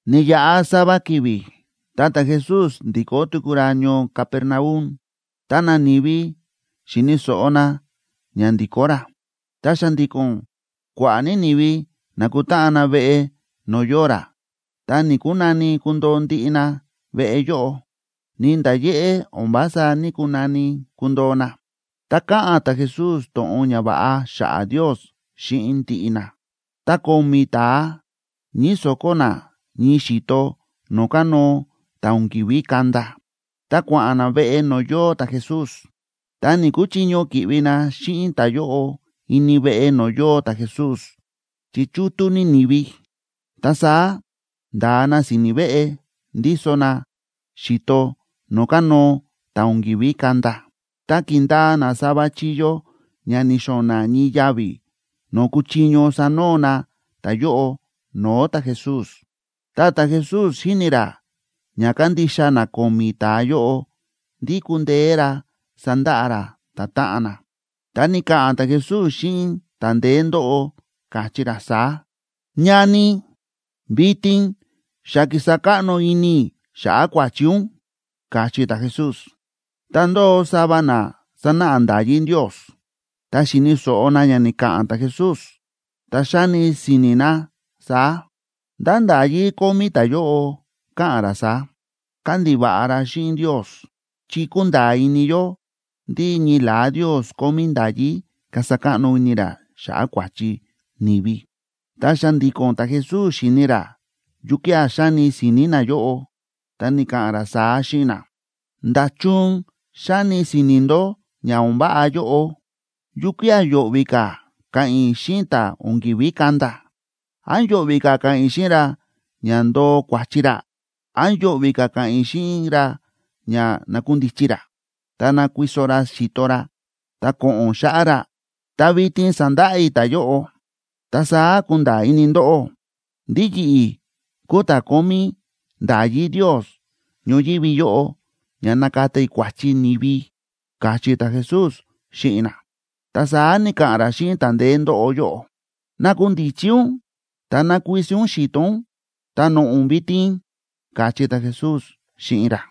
Ni̱yaꞌa sava ki̱vi̱ ta ta̱Jesús ndi̱kó tuku ra ñoo Capernaum, ta nani̱vi xi̱ni̱ so̱ꞌo na ña ndi̱kó ra. Ta xa̱ndi̱ko̱n kua̱ꞌa̱ ní ni̱vi na̱kutáꞌan na veꞌe no̱o̱ yóo ra, ta ni̱‑kunani kundoo ndiꞌi na veꞌe yóꞌo, ni nda̱ yéꞌé o̱n vása ní‑kunani kundoo na. Ta káꞌa̱n ta̱Jesús to̱ꞌon ñava̱ꞌa xa̱ꞌa̱ Ndios xíꞌin ndiꞌi na. Ta ko̱mi̱ ta̱a ñíso̱kó na ñii xi̱to no̱o̱ kánóo ta̱ o̱n ki̱ví kanda, ta kua̱ꞌa̱n na veꞌe no̱o̱ yóo ta̱Jesús. Ta ni̱‑kuchiño ki̱ꞌvi na xíꞌin ta̱yóꞌo ini veꞌe no̱o̱ yóo ta̱Jesús chi chútú ní ni̱vi. Ta saá nda̱a na si̱ni̱ veꞌe, ndíso na xi̱to no̱o̱ kánóo ta̱ o̱n ki̱ví kanda, ta ki̱ndaa na sava chíyó ña ni̱xo̱na̱ ñii yavi̱ no̱o̱ kuchiño sanoo na ta̱yóꞌo no̱o̱ ta̱Jesús. Tá ta̱Jesús xi̱ni ra ña kándixa na ko̱mi̱ ta̱a yóꞌo ndí kúndeé ra sandaꞌa ra ta̱táꞌan na, ta ni̱ka̱ꞌa̱n ta̱Jesús xíꞌin ta̱ ndeé ndóꞌo, káchí ra saá: ―Ñani, vitin xa ki̱sa káꞌno ini i̱ xa̱ꞌa̱ kua̱chi ún ―káchí ta̱Jesús. Ta ndóo sava na sánáꞌa nda̱yí Ndios, ta xi̱ni̱ so̱ꞌo na ña ni̱ka̱ꞌa̱n ta̱Jesús, ta xáni si̱ni̱ na saá: “¿Ndá nda̱yí kómí ta̱yóꞌo ka̱ꞌa̱n ra saá? Kándiva̱ꞌa ra xíꞌin Ndios. Chi kúnda̱a̱ ini yó ndí ñii la̱á Ndios kómí nda̱yí kasa káꞌno ini ra xa̱ꞌa̱ kua̱chi ni̱vi.” Ta xa̱ndi̱ko̱n ta̱Jesús xíni̱ ra yukía̱ xáni si̱ni̱ nayóꞌo, ta ni̱ka̱ꞌa̱n ra saá xíꞌin na: ―¿Nda̱chun xáni si̱ni̱ ndó ña o̱n váꞌa yóꞌo? ¿Yukía̱ yo̱ꞌvi̱ ka̱ ka̱ꞌa̱n i̱ xíꞌin ta̱ o̱n ki̱ví kanda? ¿Án yo̱ꞌvi̱ ka̱ ka̱ꞌa̱n i̱ xíꞌin ra ña ndoo kua̱chi ra? ¿Án yo̱ꞌvi̱ ka̱ ka̱ꞌa̱n i̱ xíꞌin ra ña nakundichi ra, ta ná kuiso ra xi̱to ra ta ko̱ꞌo̱n xáꞌá ra? Ta vitin sandaꞌa i̱ ta̱yóꞌo, ta saá kunda̱a̱ ini ndóꞌó ndí yi̱ꞌi̱ kúu ta̱ kómí nda̱yí Ndios ñoyívi yóꞌo ña nakata i̱ kua̱chi ni̱vi ―káchí ta̱Jesús xíꞌin na. Ta saá ni̱ka̱ꞌa̱n ra xíꞌin ta̱ ndeé ndóꞌo yóꞌo: ―Nakundichi ún ta ná kuiso ún xi̱to ún, ta noꞌo̱ ún vitin ―káchí ta̱Jesús xíꞌin ra.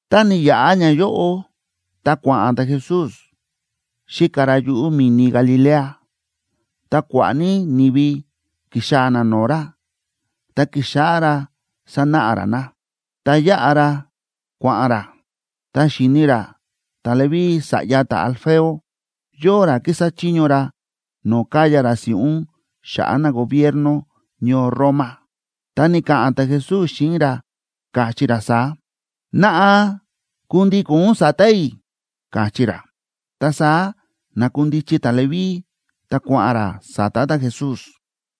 Ta ni̱yaꞌa ñayóꞌo, ta kua̱ꞌa̱n ta̱Jesús xíka ra yuꞌu̱ mi̱ni Galilea. Ta kua̱ꞌa̱ ní ni̱vi ki̱xaa̱ na no̱o̱ ra, ta ki̱xáꞌá ra sánáꞌa ra na. Ta yáꞌa ra kua̱ꞌa̱n ra, ta xi̱ni ra ta̱Leví sa̱ꞌya ta̱Alfeo, yóo ra kísa chiño ra no̱o̱ káya ra si̱ꞌún xa̱ꞌa̱ nagobierno ñoo Roma. Ta ni̱ka̱ꞌa̱n ta̱Jesús xíꞌin ra, káchí ra saá: ―Naꞌa, kundíko̱n ún sa̱ta̱ i̱ ―káchí ra. Ta saá na̱kundichi ta̱Leví, ta kua̱ꞌa̱n ra sa̱ta̱ ta̱Jesús.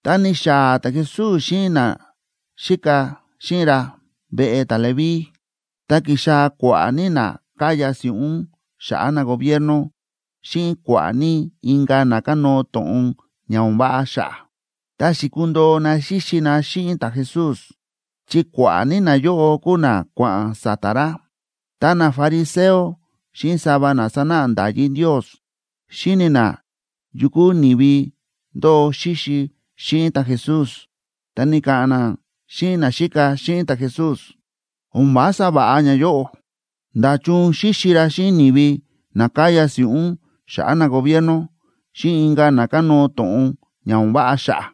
Tá ni̱xaa̱ ta̱Jesús xíꞌin naxíka xíꞌin ra veꞌe ta̱Leví, ta ki̱xaa̱ kua̱ꞌa̱ ní na káya si̱ꞌún xa̱ꞌa̱ nagobierno xíꞌin kua̱ꞌa̱ ní inka̱ na kánóo to̱ꞌon ña o̱n váꞌa xa̱ꞌa̱, ta xi̱kundoo na xíxi na xíꞌin ta̱Jesús, chi kua̱ꞌa̱ ní nayóꞌo kúu na kua̱ꞌa̱n sa̱ta̱ ra. Ta nafariseo xíꞌin sava na sánáꞌa nda̱yí Ndios xi̱ni na yu kúu ni̱vi ndóo xíxi xíꞌin ta̱Jesús, ta ni̱ka̱ꞌa̱n na xíꞌin naxíka xíꞌin ta̱Jesús: ―O̱n vása va̱ꞌa ñayóꞌo. ¿Nda̱chun xíxi ra xíꞌin ni̱vi na káya si̱ꞌún xa̱ꞌa̱ nagobierno, xíꞌin inka̱ na kánóo to̱ꞌon ña o̱n váꞌa xa̱ꞌa̱?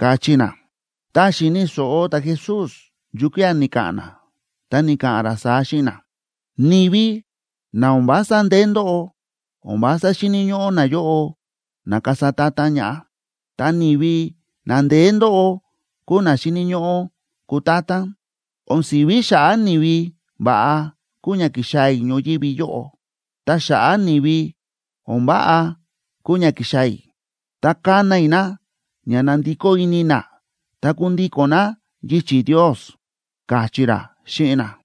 ―káchí na. Ta xi̱ni̱ so̱ꞌo ta̱Jesús yukía̱ ni̱ka̱ꞌa̱n na, ta ni̱ka̱ꞌa̱n ra saá xíꞌin na: ―Ni̱vi na o̱n vása ndeé ndóꞌo, o̱n vása xíni̱ ñóꞌó nayóꞌo na kasa ta̱ta̱n ñaꞌá, ta ni̱vi na ndeé ndóꞌo kúu na xíni̱ ñóꞌó kutátán. O̱n si̱ví xa̱ꞌa̱ ni̱vi va̱ꞌa kúu ña ki̱xaa̱ i̱ ñoyívi yóꞌo. Ta xa̱ꞌa̱ ni̱vi o̱n váꞌa kúu ña ki̱xaa̱ i̱, ta kana i̱ na ña nandikó ini na ta kundíko̱n na yichi̱ Ndios ―káchí ra xíꞌin na.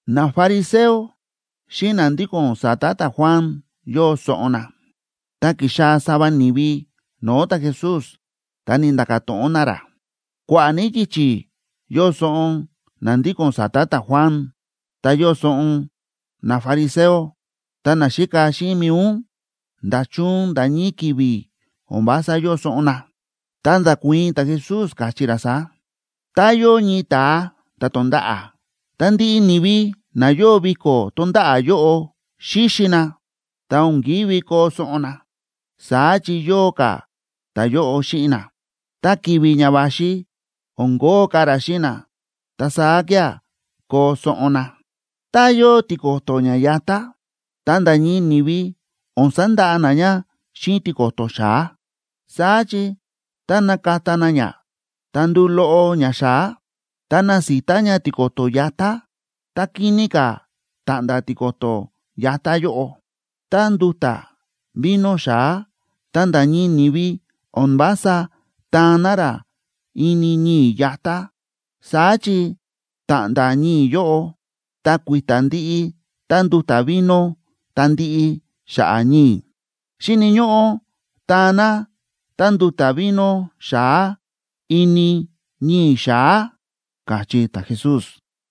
Nafariseo xíꞌin na ndíko̱n sa̱ta̱ ta̱Juan yóo soꞌon na. Ta ki̱xaa̱ sava ni̱vi no̱o̱ ta̱Jesús, ta ni̱nda̱ka̱ to̱ꞌon na ra: ―Kua̱ꞌa̱ ní yichi̱ yóo soꞌon na ndíko̱n sa̱ta̱ ta̱Juan, ta yóo soꞌon nafariseo. Ta naxíka xíꞌin mi̱i ún, ¿nda̱chun nda̱ ñii ki̱vi̱ o̱n vása yóo soꞌon na? Ta nda̱kuii̱n ta̱Jesús, káchí ra saá: ―Tá yóo ñii ta̱a ta̱ tonda̱ꞌa̱, ta ndiꞌi ni̱vi na yóo viko̱ tonda̱ꞌa̱ yóꞌo xíxi na, ta o̱n ki̱ví koo soꞌon na, saá chi yóo ka̱ ta̱yóꞌo xíꞌin na. Ta ki̱vi̱ ña va̱xi o̱n kóo ka̱ ra xíꞌin na. Ta saá kía̱ koo soꞌon na. ’Tá yóo tiko̱to̱ ña yatá, ta nda̱ ñii ni̱vi o̱n sandaꞌa na ña xíꞌin tiko̱to̱ xa̱á, saá chi tá nakata na ña, ta nduu loꞌo ña xa̱á, ta nasita ña tiko̱to̱ yatá, ta kini ka̱ ta̱ꞌnda̱ tiko̱to̱ yatá yóꞌo. Ta nduta̱ vino xa̱á, ta nda̱ ñii ni̱vi o̱n vása taan na rá ini ñii̱ yatá, saá chi ta̱ꞌnda̱ ñii̱ yóꞌo, ta kui̱ta̱ ndiꞌi tánduta̱ vino ta ndiꞌi xa̱ꞌa̱ ñii̱. Xíni̱ ñóꞌó taan na tánduta̱ vino xa̱á ini ñii̱ xa̱á ―káchí ta̱Jesús.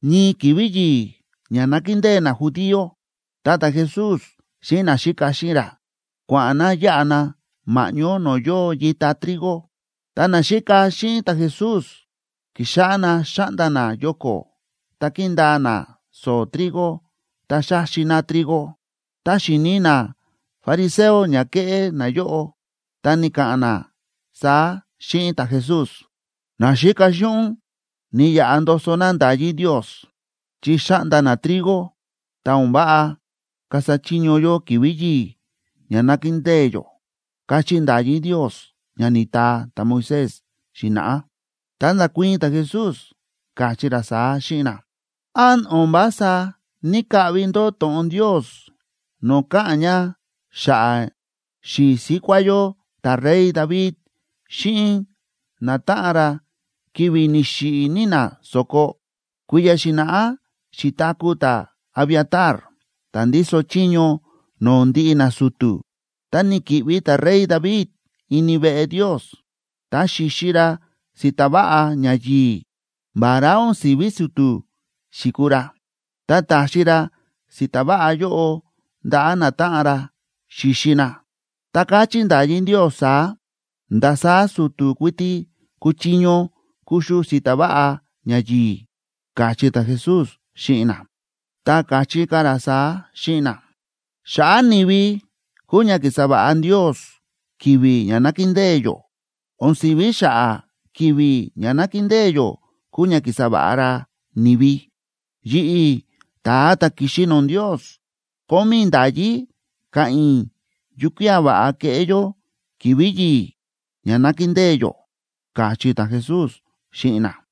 Ñii ki̱vi̱ yi̱i̱ ña nákindée najudío, ta ta̱Jesús xíꞌin naxíka xíꞌin ra, kua̱ꞌa̱n na yáꞌa na ma̱ꞌñó no̱o̱ yóo yita trigo. Ta naxíka xíꞌin ta̱Jesús ki̱xáꞌá na xa̱ꞌnda na yoko̱ ta ki̱ndaa na so̱o̱ trigo, ta xa̱xi na trigo. Ta xi̱ni nafariseo ña ke̱ꞌé nayóꞌo, ta ni̱ka̱ꞌa̱n na saá xíꞌin ta̱Jesús: ―Naxíka xíꞌin ún ni̱yaꞌa ndoso na nda̱yí Ndios chi xa̱ꞌnda na trigo, ta o̱n váꞌa kasa chiño yó ki̱vi̱ yi̱i̱ ña nákindée yó, káchí nda̱yí Ndios ña ni̱taa ta̱Moisés xi̱na̱ꞌá. Ta nda̱kuii̱n ta̱Jesús, káchí ra saá xíꞌin na: ―¿Án o̱n vása ní‑kaꞌvi ndó to̱ꞌon Ndios no̱o̱ káꞌa̱n ña xa̱ꞌa̱ xi̱i̱ síkuá yó ta̱rey David xíꞌin natáꞌan ra, ki̱vi̱ ni̱xiꞌi̱ ní na so̱ko? Kui̱ya̱ xi̱na̱ꞌá xi̱taku̱ ta̱Abiatar ta̱ ndíso chiño no̱o̱ ndiꞌi nasu̱tu̱, ta ni̱ki̱ꞌvi ta̱rey David ini veꞌe Ndios, ta xi̱xi ra si̱ta̱ váꞌa ñayi̱i̱ vará o̱n si̱ví su̱tu̱ xi̱kuu ra. Ta ta̱xi ra si̱ta̱ váꞌa yóꞌo ndaꞌa̱ natáꞌan ra xi̱xi na. Ta káchí nda̱yí Ndios saá: “Ndasaá su̱tu̱ kuiti kúchiño kuxu si̱ta̱ váꞌa ñayi̱i̱” ―káchí ta̱Jesús xíꞌin na. Ta káchí ka̱ ra saá xíꞌin na: ―Xa̱ꞌa̱ ni̱vi kúu ña ki̱sa va̱ꞌa Ndios ki̱vi̱ ña nákindée yó, o̱n si̱ví xa̱ꞌa̱ ki̱vi̱ ña nákindée yó kúu ña ki̱sa va̱ꞌa ra ni̱vi. Yi̱ꞌi̱, ta̱a ta̱ ki̱xi no̱o̱ Ndios, kómí i̱ nda̱yí ka̱ꞌa̱n i̱ yukía̱ va̱ꞌa keꞌé yó ki̱vi̱ yi̱i̱ ña nákindée yó ―káchí ta̱Jesús xíꞌin na.